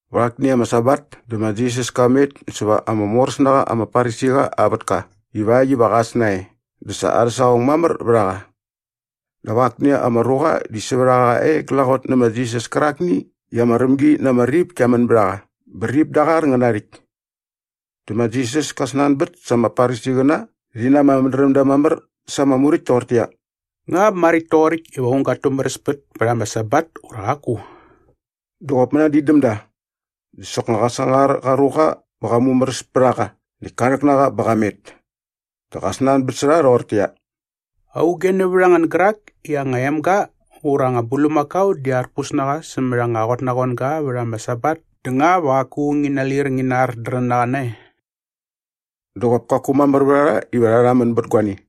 Vät akni ama Sabat dä ma Jisas ka met säva ama moräs na qa ama Farisiqa aa vätka ivakt iva qa äs nae dä sa arhä saqong mamär vät a qa. Dap akni ama ruqa di sävät a qa e glaqot nä ma Jisas kärakni i ama rämgi na ama rip kia män bät a qa bä rip da aa qar ngä na aa rhäkt. Dä ma Jisas ka snanbät sa ama Farisiqäna rhi na ama mädrämda mamär sa ama muräkt toqortäqyia, “Nga maräkt toqoräkt iva aung gat tumäräspät pät ama Sabat ura qaku?” Dä qop mänadin däm da. Dä soknga qa sangar qa ruqa bä qa mumäräs pät a qa näkt ka rhäk na qa bä qa met. Dä qa snanbät sä rha rhoqortäqyia, “Auge nävät a ngän gärak i aa anga emga ura anga bulmakao di arpus na qa sämät anga qotnaqoanga vät ama Sabat dä nga va qaku ngi nalir ngi nardrän na qa nae?” Dä qop kaku mamär vät a rha iva rha rhamän bät guani.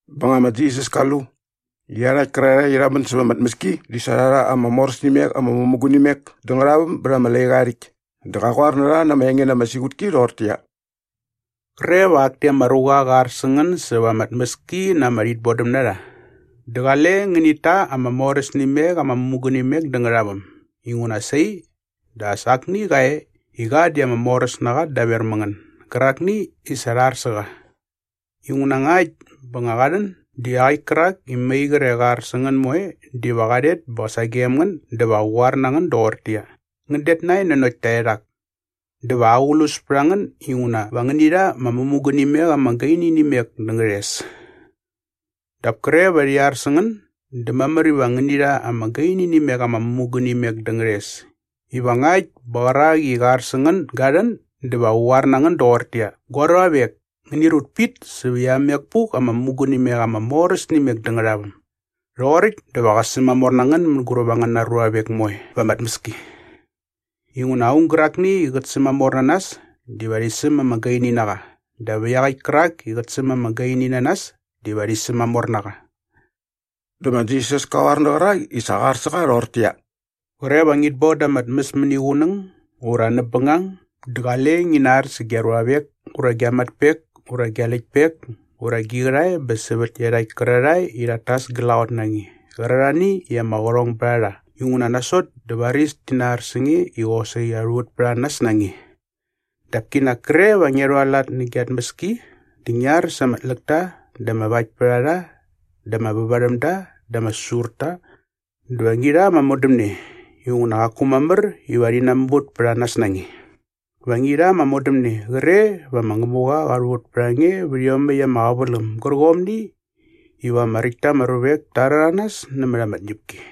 Bä nga ma Jisas ka lu i iarhakt kärarhae i rha män säva ama tmäski di sa rha rha ama moräs nä imek ama mämugunimek dä ngärhaväm bät ama laiqa aa rhäkt dä qa qoar na rha na ama enge na ama siqutki rhoqortäqyia, “Qre va akni ama ruqa qä ar sä ngän säva ama tmäski na ama rhitbodämnarha dä qale ngänit ta ama moräs nä imek ama mämugunimek dä ngärhaväm inguna sai dä as akni qa e i qa di ama moräs na qa daver mä ngän gärakni i sa qa ar sä qa. Inguna ngakt bä nga qa rhän dä iaqäkt kärak i mai qre qa ar sä ngän moe diva qa rhet bä sagem ngän dä va qä qoar na ngän doqortäqyia, ‘Ngän det nae nanokt taerhak.’ Dä va aqlus pät a ngän inguna va ngäni rha ama mämugunimek ama gaini nä imek dä ngärhes. “Dap kre va rhi ar sä ngän dä mamär iva ngäni rha ama gaini nä imek ama mämugunimek dä ngärhes iva ngakt bä qärak i qä ar sä ngän ga rhän dä va qä qoar na ngän doqortäqyia, ‘Gua ruavek, ngäni rut pit säp iamek puk ama mämugunimek ama moräs nä imek dä ngärhaväm.’ Rhoqoräkt dä va qä sämamor na ngän mänguräp angäna ruavek moe va ama tmäski. Inguna aung gärakni i qät sämamor na nas diva rhi säm ama gaini na qa dap iaqäkt kärak i qät säm ama gaini na nas diva rhi sämamor na qa.” Dä ma Jisas ka qoar nä qärak i sa qa ar sä qa rhoqortäqyia, “Qre va ngit boda ama tmäs mäniqunäng ura näp bängang dä qale ngi nar sä gia ruavek ura gia matpek ura gia läktpek ura gi qärhae bä sävät iarhakt kärarhae i rhat tas glaqot na nge qärarhani i ama qärhong bät a rha inguna nasot dä varis ti nar sä nge i qosaqi rha rhuvät pät a nas na nge. Dap kinak kre va ngia rhualat nä gia tmäski dä ngi ar sa ama tläkta dä ama vaktpärharha dä ama vävarhämda dä ama säsurta dä va ngi rha ama modämne inguna qaku mamär iva rhi namuvät pät a nas na nge. Va ngi rha ama modämne qre va ma Ngämuqa qa rhuvät pät a nge vät iomäkt ama qäväläm gärqomni iva ama räkt ta ama ruvek ta rhäranas nämät ama tñäpki.”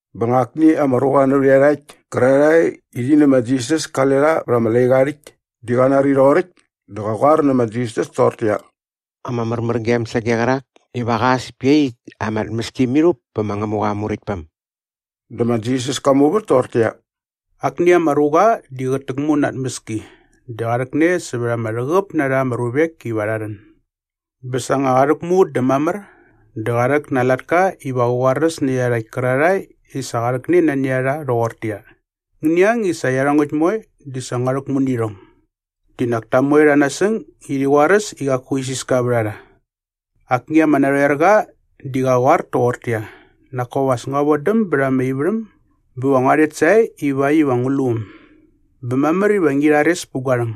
Bä nga akni ama ruqa nävät iarhakt kärarhae i rhi nä ma Jisas kale rha bät ama laiqa aa rhäkt di qa nari rhoqoräkt dä qa qoar nä ma Jisas toqortäqyia, “Ama märmärgem sage qärak iva qa äs pä iaqyäkt ama tmäski mirhup pä ma Ngämuqa aa Muräktpäm.” Dä ma Jisas ka muvät toqortäqyia, “Akni ama ruqa di qät täkmu na aa tmäski dä qa rhäkne sävät ama rhäqäp na rha ama ruvek iva rha rhän. Bä sa nga qa rhäkmu dä mamär dä qa rhäk na aa latka iva qä qoaräs nä iarhakt kärarhae i sa qa rhäkne nani a rha rhoqortäqyia, ‘Ngäni ang i sä iarhongäkt moe di sa ngua rhäkmu nä irhong.’” “Di nak ta moe rha nasäng i rhi qoaräs i qaku isiska vät a rha. Akni ama narhoerqa di qa qoar toqortäqyia, ‘Nak kop as ngua vodäm bät ama ivärhäm bä va ngua rhet sae ivakt iva ngu lu äm. Bä mamär iva ngi rhares pät gua rhäng.’”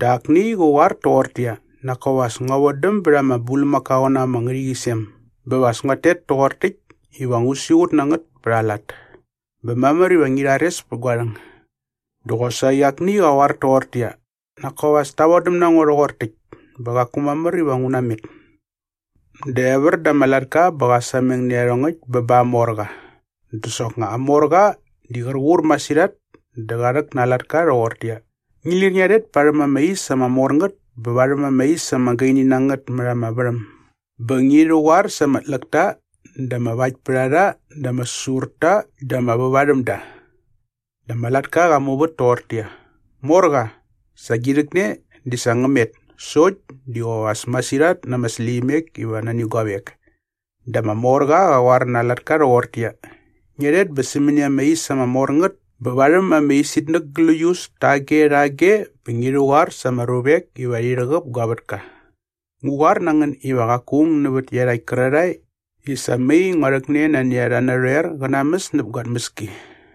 “Dä akni qä qoar toqortäqyia, ‘Nak kop as ngua vodäm bät ama bulmakaoqäna ama ngärhäqyisem bä va as nguat tet toqor täkt iva ngu siqut na ngät pät a lat. Bä mamär iva ngi rhares pät gua rhäng.’” “Dä qosaqi akni qä qoar toqortäqyia, ‘Nak kop as ta vodäm na ngo rhoqor täkt bä qaku mamär iva ngu namet.’” “Dä evär da ama latka bä qa sameng nä iarhongäkt bä ba aa morqa. Dä soknga aa morqa di qär qur masirhat dä qa rhäk na aa latka rhoqortäqyia, ‘Ngi lir ngia rhet parhäm ama is ama mor ngät bä varhäm ama is ama gaini na ngät mät ama värhäm bä ngi rhäqoar sa ama tläkta dä ama vaktpärharha dä ama säsurta dä ama vävarhämda.’” “Dä ama latka qa muvät toqortäqyia, ‘Morqa, sa gi rhäkne di sa ngä met sokt di qop as masirhat na ama släqyimek iva nani guavek.’” “Dä ama morqa qa qoar na aa latka rhoqortäqyia, ‘Ngia rhet bä sämäni ama is ama mor ngät bä varhäm ama isitnäk gläius tage rhage bä ngi rhäqoar sa ama ruvek iva rhi rhäqäp gua vätka. Ngu qoar na ngän iva qaku aung nävät iarhakt kärarhae i sa mai ngua rhäkne nani a rha narhoer qä namäs näp gua tmäski.’”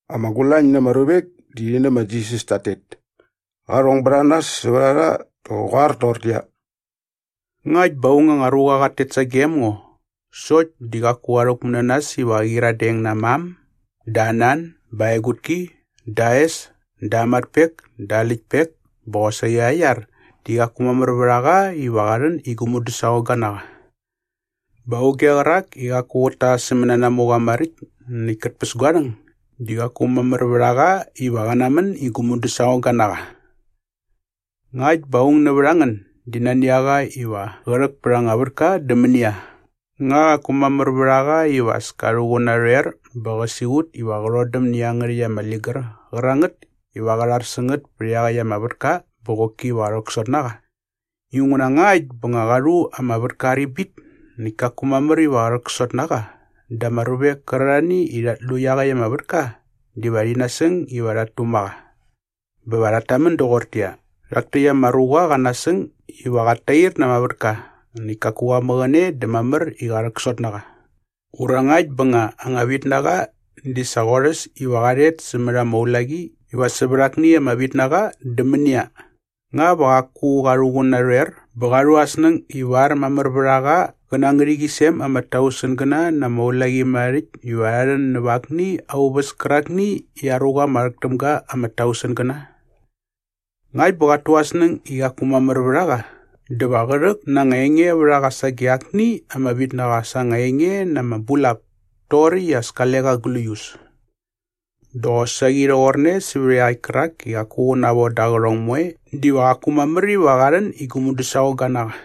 Ama gulañ na ama ruvek di rhi nä ma Jisas tat tet. Qa rhong bät a nas sävät a rha dä qä qoar toqortäqyia, “Ngakt bä aung anga ruqa qat tet sagem ngo sokt di qaku qa rhäkmu na nas iva qä naqyiradeng na aa mam dä aa nan bä aa egutki dä aa es dä aa matpek dä aa läktpek bä qosaqi aa iar di qaku mamär vät a qa iva qa rhän i gu mudäsaqongga na qa. “Bä auge qärak i qaku qät ta aa sämänanamuqa maräkt näkt kät päs gua rhäng di qaku mamär vät a qa iva qä namän i gu mudäsaqongga na qa.” “Ngakt bä nga aung nävät a ngän di nani a qa iva qä rhäk pät anga vätka dä mänia, nga qaku mamär iva as ka rhuqun narhoer bä qä siqut iva qä rhodäm nä iangärhäkt ama ligär qärangät iva qä rhar sä ngät pät ama vätka bä qoki va qä rhäksot na qa? Inguna ngakt bä nga qa rhu ama vätka aa ribit näkt kaku mamär iva qä narhäksot na qa dä ama ruvek kärarhani i rhat lu iaqäkt ama vätka diva rhi nasäng iva rhat tuma qa bä va rhat tamän doqortäqyia, ‘Rhak täkt ama ruqa qa nasäng iva qat tair na ama vätka näkt kaku qa mäqäne dä mamär i qä rhäksot na qa.’ “Ura ngakt bä nga anga vitnaqa di sa qorhäs iva qa rhet sämät ama ulaqi iva sävät akni ama vitnaqa dä mänia? Nga va qaku qa rhuqun narhoer bä qa rhu aa snäng ivar mamär vät a qa qä na aa ngärhäqyisem ama tausengäna na ama ulaqimärharhärhäkt iva rha rhän näp akni aa uväs kärakni i aa ruqa ama rhäk täm ga ama tausengäna? Ngakt bä qat tu aa snäng i qaku mamär vät a qa dä va qä rhäk na anga engevärharha sage akni ama vitnaqa sa anga enge na ama bulap toqoräkt i as kale qa gläius. Dä qosaqi rhoqorne sävät iaqäkt kärak i qaku qä navoda aa qärhong moe diva qaku mamär iva qa rhän i gu mudäsaqongga na qa.”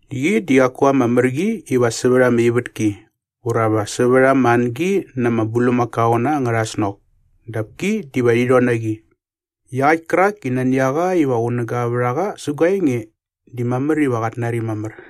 Qi di qaku ama mär qi iva sävät ama ivätki ura va sävät ama angi na ama bulmakaoqäna angärha snok dap ki diva rhi rhon na qi. Iaqäkt kärak i nani a qa iva qunäga vät a qa sä gua enge di mamär iva qat nari mamär.”